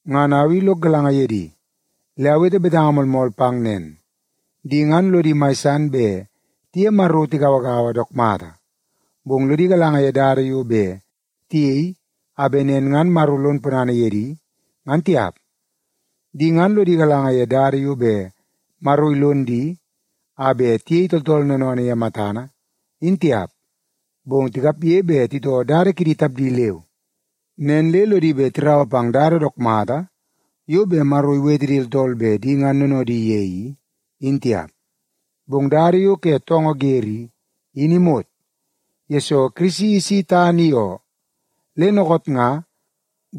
Ngan au i lok galanga ye di, le awete betanga moolmool pang nen, di ngan lodi mai san bet tiye Maro tigauagaua dook mata, bong lodi galanga ye dada yo bet tiyei a bet nen ngan Maro lon ponana ye di, ngan tiap. Di ngan lodi galanga ye dada yo bet Maro ilon di a bet tiyei tooltool noonoonoo ye matana, in tiap. Bong tikapge bet titoo dada kidi tapdi leu, nen le lodi bet tiraua pang dada dook mata yo bet Maro iwete di tooltool bet di ngan noonoodi ye i, in tiap. Bong dada yo ke toongoo wer i, in imot, yesoo Kirisi isi tana i oo. Le dookoot nga,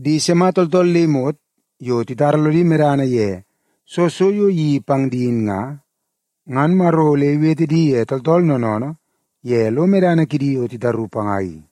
di sima tooltool le imot yo titara lodi medana ye soo so yo iyeii pang di in nga, ngan Maro ole iwete di ye tooltool noonoonoo ye lo medana kidi yo titaru panga i.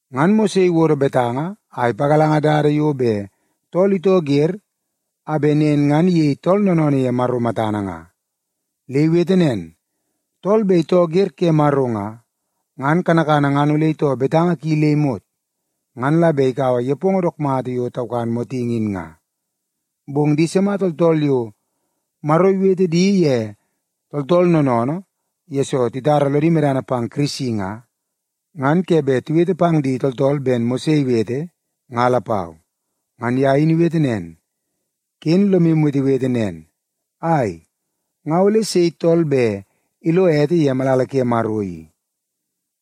Ngan Mose iwodo betanga a ipagalanga dada yo bet tool itoo wer a bet nen ngan iyei tool noonoonoo ye Maro matana nga. Le iwete nen, “Tool bet itoo wer ke Maro nga, ngan kanakana ngan ole itoo betanga ki le imot, ngan la bet ikaua nepongo dook mata yo taukan motingi in nga.” Bong di sima tooltool yo Maro iwete di ye tooltool noonoonoo yesoo titara lodi medana pang Kirisi nga, ngan ke bet tiwete pang di tooltool ben Mose iwete, nga lapau. Ngan ye in iwete nen, “Ken lom wetewete nen, ‘Ai, nga ole sei tool bet ilo ete ye malala ke Maro i?’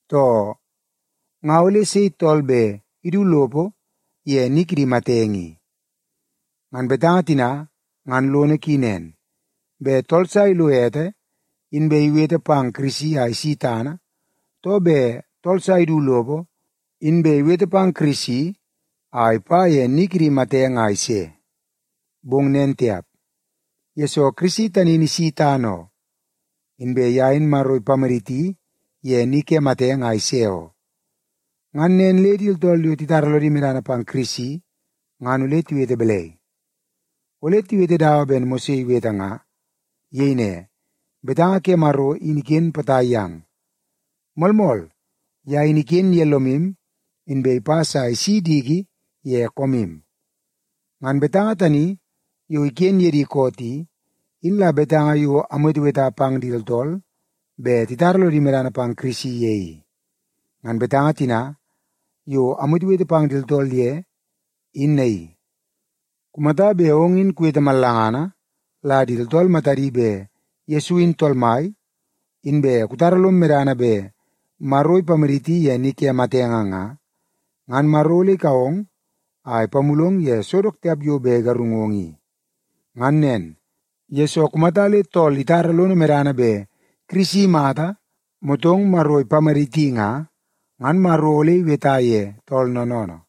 too, ‘Nga ole sei tool bet idu lopo ye ni kidi matenge i?’” (Ngan betanga tina ngan lono ki nen: Bet tool sa ilo ete inbe iwete pang Kirisi a isi tana, too bet tool sa idu lopo inbe iwete pang Kirisi a ipa ye ni kidi matenge a ise. Bong nen tiap, yesoo Kirisi tani in isi tana oo, inbe ye in Maro ipamaditi ye ni ke matenge a ise oo.) Ngan nen le di tooltool yo titara lodi medana pang Kirisi ngan ole tiwete balai? Ole tiwete dawa ben Mose iwete nga. Iyei ne, “Betanga ke Maro in iken potai yang. Moolmool, ye in iken ye lomu inbe ipas a isi diki ye koomu.” Ngan betanga tani yo iken ye di koot i, in la betanga yo amweteweta pang di tooltool bet titara lodi medana pang Kirisi ye i. Ngan betanga tina yo amwetewete pang di tooltool ye in naii; kumata bet ong in kuwete mallangana la di tooltool matadi bet Yesu in Tool Mai, inbe kutara lom medana bet Maro ipamaditi ye ni kidi matenge nga, ngan Maro ole ikau ong a ipamulong ye so dook tiap yo bet igarungong i. Ngan nen, yesoo kumata le tool itara lono medana bet Kirisi imata motong Maro ipamaditi nga, ngan Maro ole iweta ye tool noonoonoo.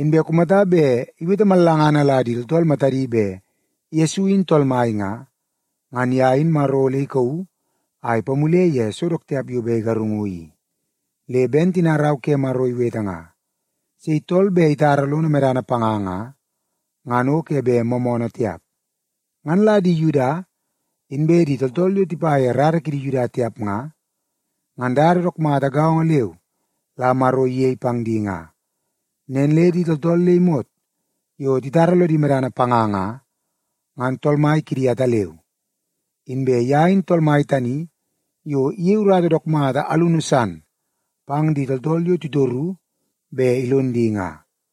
Inbe kumata bet iwete mallangana la di tooltool matadi bet Yesu in Tool Mai nga, ngan ye in Maro ole ikauu a ipamule ye so dook tiap yo bet igarungu i. Le ben tina Rau ke Maro iwete nga, “Sei tool bet itara lono medana panga nga, ngan o ke bet moomoonoo tiap.” Ngan la di Yuda inbe di tooltool yo tipa ye rara kidi Yuda tiap nga, ngan dada dook mata gaongo leu la Maro iyei pang di nga. Nen le di tooltool le imot yo titara lodi medana panga nga, ngan Tool Mai kidi ataleu. Inbe ye in Tool Mai tani yo iyei urata dook mata alunu san pang di tooltool yo titoru bet ilon di nga.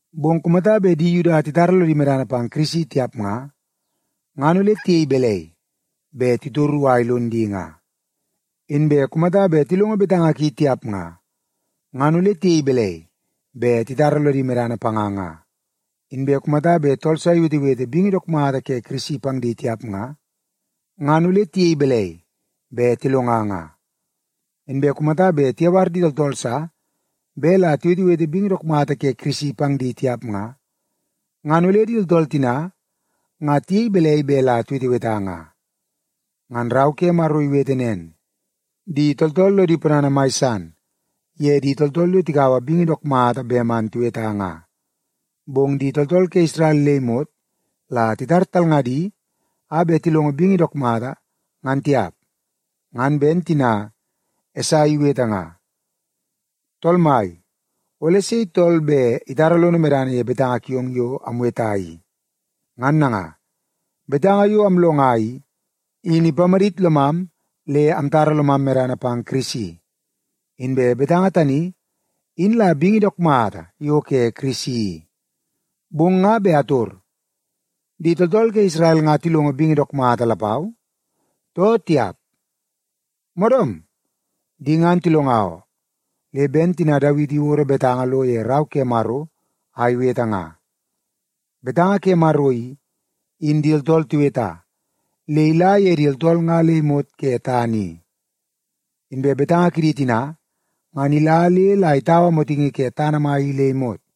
Bong kumata bet di Yuda titara lodi medana pang Kirisi tiap nga, ngan ole tiyei balai bet titoru a ilon di nga? Inbe kumata bet tilongo betanga ki tiap nga, ngan ole tiyei balai bet titara lodi medana panga nga? Inbe kumata bet tool sa iwetewete bingi dook mata ke Kirisi pang di tiap nga, ngan ole tiyei balai bet tilonga nga? Inbe kumata bet tiyawar di tooltool sa bet la tiwetewete bingi dook mata ke Kirisi pang di tiap nga, ngan ole di tooltool tina ngan tiyei balai bet la tiweteweta nga? Ngan Rau ke Maro iwete nen, “Di tooltool lodi ponana mai san ye di tooltool yo tikaua bingi dook mata bet man tiweta nga.” Bong di tooltool ke Isrel le imot la titar talngadi a bet tilongo bingi dook mata, ngan tiap. Ngan ben tina Esai iwete nga, “Tool Mai, ole sei tool bet itara lono medana ye betanga kiong yo amweta i?” Ngan nanga, betanga yo amlonga i, in ipamadit lomam le amtara lomam medana pang Kirisi. Inbe betanga tani, in la bingi dook mata yo ke Kirisi i. Bong nga bet ator: Di tooltool ke Isrel nga tilongo bingi dook mata lapau, too tiap? Moodoom, di ngan tilonga oo. Le ben tina Dawiti iwodo betanga lo ye Rau ke Maro a iwete nga, “Betanga ke Maro i, in di tooltool tiweta, le ila ye di tooltool nga le imot ke tana i, inbe betanga kidi tina, ngan ila le la itaua motingi ke tana mai i le imot.”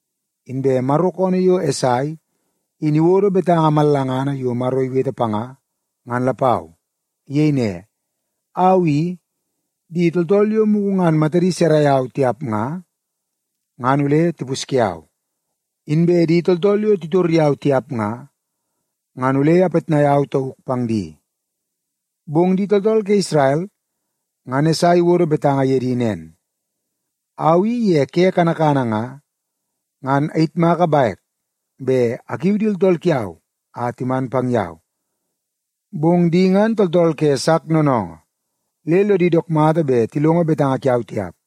Inbe Maro koonoo yo Esai in iwodo betanga mallangana yo Maro iwete panga, ngan lapau. Iyei ne, “Au i, di tooltool yo mugu ngan matadi sarai au tiap nga, ngan ole tipusye au. Inbe di tooltool yo titor yau tiap nga, ngan ole apitnai au tauk pang di.” Bong di tooltool ke Isrel ngan Esai iwodo betanga ye di nen, “Au i ye ke kanakana nga, ngan ayitmaka bek bet akiu di tooltool kiau a timan pang yau, bong di ngan tooltool ke sak noonoongoo le lodi dook mata bet tilongo betanga kiau tiap.”